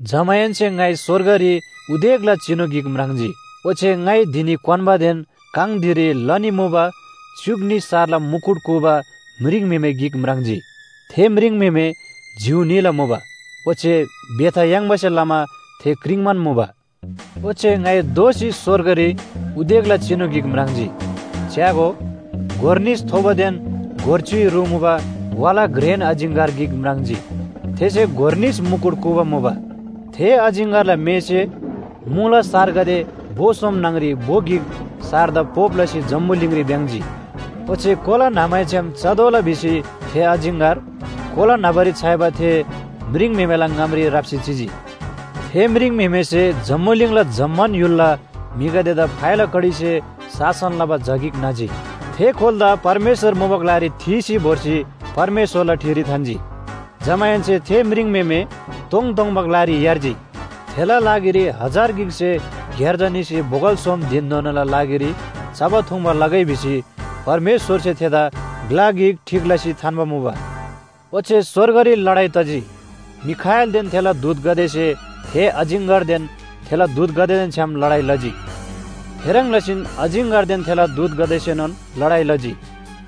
जमाहेन्‍से ङाइ स्‍वर्गरी उदेकला चिनु गिक म्राङ्जी। ओच्‍छे ङाइ धिनी क्‍वान्‍बादेन काङ धिरी लनी मुबा च्‍युक न्‍ही सारला मुकुट कूबा म्रिङम्‍हेमे गिक म्राङ्जी। थे म्रिङम्‍हेमे जिउ न्‍हीला मुबा, ओच्‍छे बेथा याङ्बासे लमा थे क्रिङ्‌बान मुबा। ओच्‍छे ङाइ दोःसी स्‍वर्गरी उदेकला चिनु गिक म्राङ्जी। च्‍यागो, गोर निस थोबोदेन गोर च्‍युइ रु मुबा वाला घ्रेन अजिङ्‍गर गिक म्राङ्जी। थेसे गोर निस मुकुट कूबा मुबा। थे अजिङ्‍गरला मेःसे मुला सारगदे भो सोम न्‍हङरी भो गिक सारदा पोप लसी जम्‍बुलिङरी भ्‍याङ्‍जी। ओच्‍छे कोला न्‍हमैछ्‌याम चतोःला भिसी थे अजिङ्‍गर कोला न्‍हबारी छ्‌याइबा थे म्रिङम्‍हेमेला ङामरी राप्‍सी चिजी। थे म्रिङम्‍हेमेसे जम्‍बुलिङला जम्‍मान य्‍हुलला म्‍हिगदेदा फाइला कडीसे शासन लबा झा गिक न्‍हजी। थे कोलादा परमेश्‍वर मुबा ग्‍लारी थीसी भोर्सी परमेश्‍वरला ठिरी थान्‍जी। जमाहेन्‍से थे म्रिङम्‍हेमे तोङतोङबा ग्‍लारी यार्जी। थेला लागिरी हजार गिकसे ग्‍यार्जा न्‍हीसे बोगल सोम धिनधोनाला लागिरी चबा थुङ्बा लगै भिसी परमेश्‍वरसे थेदा ग्‍ला गिक ठीक लसी थान्‍बा मुबा। ओच्‍छे स्‍वर्गरी लडाइ तजी। मिखाएलदेन थेला दूतगदेसे थे अजिङ्‍गरदेन थेला दूतगदेदेन छ्‌याम लडाइ लजी। थेह्रङ् लसीन अजिङ्‍गरदेन थेला दूतगदेसेनोन लडाइ लजी।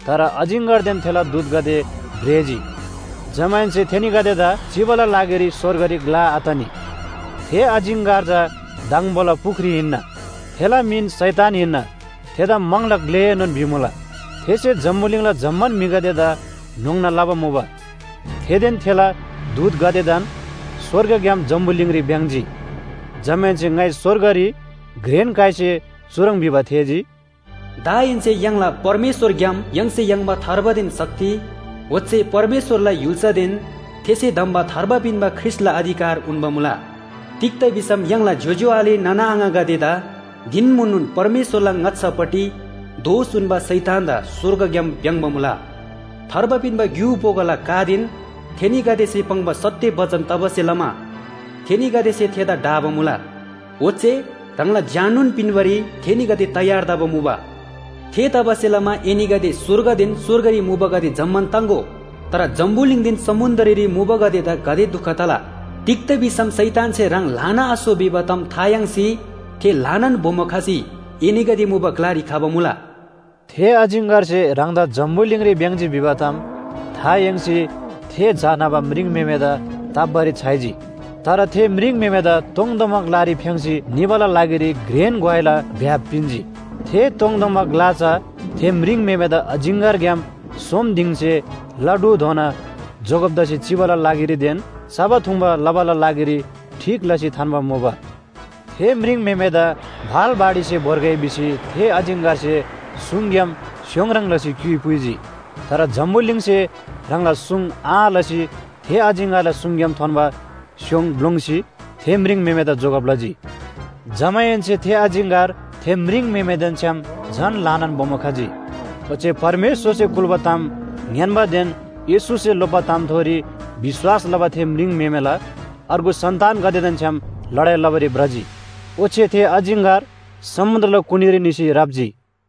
तर अजिङ्‍गरदेन थेला दूतगदे भ्रेजी। जमाहेन्‍से थेनीगदेदा चिबाला लागिरी स्‍वर्गरी ग्‍ला आतनी। थे अजिङ्‍गर चा दङबोला पुख्री हिन्‍ना। थेला मिन शैतान हिन्‍ना, थेदा म्‍हङला ग्‍लेएनोन भिमुला। थेसे जम्‍बुलिङला जम्‍मान म्‍हिगदेदा न्‍होङ्ना लबा मुबा। थेदेन थेला दूतगदेदान स्‍वर्गग्‍याम जम्‍बुलिङरी भ्‍याङ्‍जी। जमाहेन्‍से ङाइ स्‍वर्गरी घ्रेन काइसे चुह्रङ् भिबा थेःजी, “दाहेन्‍से य्‍हाङला परमेश्‍वरग्‍याम य्‍हाङसे याङ्बा थार्बादेन शक्ति ओच्‍छे परमेश्‍वरला य्‍हुल्‍सादेन थेसे धम्‍बा थार्बा पिन्‍बा ख्रीष्‍टला अधिकार उन्‍बा मुला। तिग्‍दा भिसम य्‍हाङला ज्‍योज्‍यो आले नाना आङागदेदा धिन म्‍हुननोन परमेश्‍वरला ङाच्‍छापट्टि दोष उन्‍बा शैतानदा स्‍वर्गग्‍याम भ्‍याङ्‍बा मुला। थार्बा पिन्‍बा ग्‍यु बोगोला कादेन थेनीगदेसे पाङ्बा सत्‍य बचन तबासे लमा थेनीगदेसे थेदा ढाबा मुला। ओच्‍छे ह्राङला ज्‍याननोन पिन्‍बारी थेनीगदे तयार तबा मुबा। थेतबासेलमा एनीगदे स्‍वर्गदेन स्‍वर्गरी मुबागदे जम्‍मान ताङ्‍गो! तर जम्‍बुलिङदेन समुन्‍द्ररी मुबागदेदा गाते दुख तला! तिग्‍दा भिसम शैतानसे ह्राङ ल्‍हाना आसो भिबा ताम था याङ्सी थे ल्‍हानान बोमो खसी एनीगदे मुबा ग्‍लारी खबा मुला।” थे अजिङ्‍गरसे ह्राङदा जम्‍बुलिङरी भ्‍याङ्‍जी भिबा ताम था याङ्सी थे झा न्‍हबा म्रिङम्‍हेमेदा ताप्‍बारी छ्‌याइजी। तर थे म्रिङम्‍हेमेदा तोङतोङबा ग्‍लारी फ्‍याङ्‌सी निबाला लागिरी घ्रेन ग्‍वाइला भ्‍याप पिन्‍जी। थे तोङतोङबा ग्‍ला चा थे म्रिङम्‍हेमेदा अजिङ्‍गरग्‍याम सोम दिङसे ला ढुधोना जोगब तसी चिबाला लागिरीदेन चबा थुङ्बा लबाला लागिरी ठीक लसी थान्‍बा मुबा। थे म्रिङम्‍हेमेदा भाल बाढीसे भोर्गै भिसी थे अजिङ्‍गरसे सुङग्‍याम स्‍योङ ह्रङ् लसी क्‍युइ पुइजी। तर जम्‍बुलिङसे ह्राङला सुङ आँ लसी थे अजिङ्‍गरला सुङग्‍याम थोन्‍बा स्‍योङ ग्‍लोङ्‌सी थे म्रिङम्‍हेमेदा जोगब लजी। जमाहेन्‍से थे अजिङ्‍गर थे म्रिङम्‍हेमेदेन छ्‌याम झन ल्‍हानान बोमो खजी। ओच्‍छे परमेश्‍वरसे कुल्‍बा ताम ङ्‌यान्‍बादेन येशूसे लोप्‍बा तामथोरी विश्‍वास लबा थे म्रिङम्‍हेमेला अर्गु सन्‍तानगदेदेन छ्‌याम लडाइ लबारी भ्रजी। ओच्‍छे थे अजिङ्‍गर समुन्‍द्रला कुनीरी निसी राप्‍जी।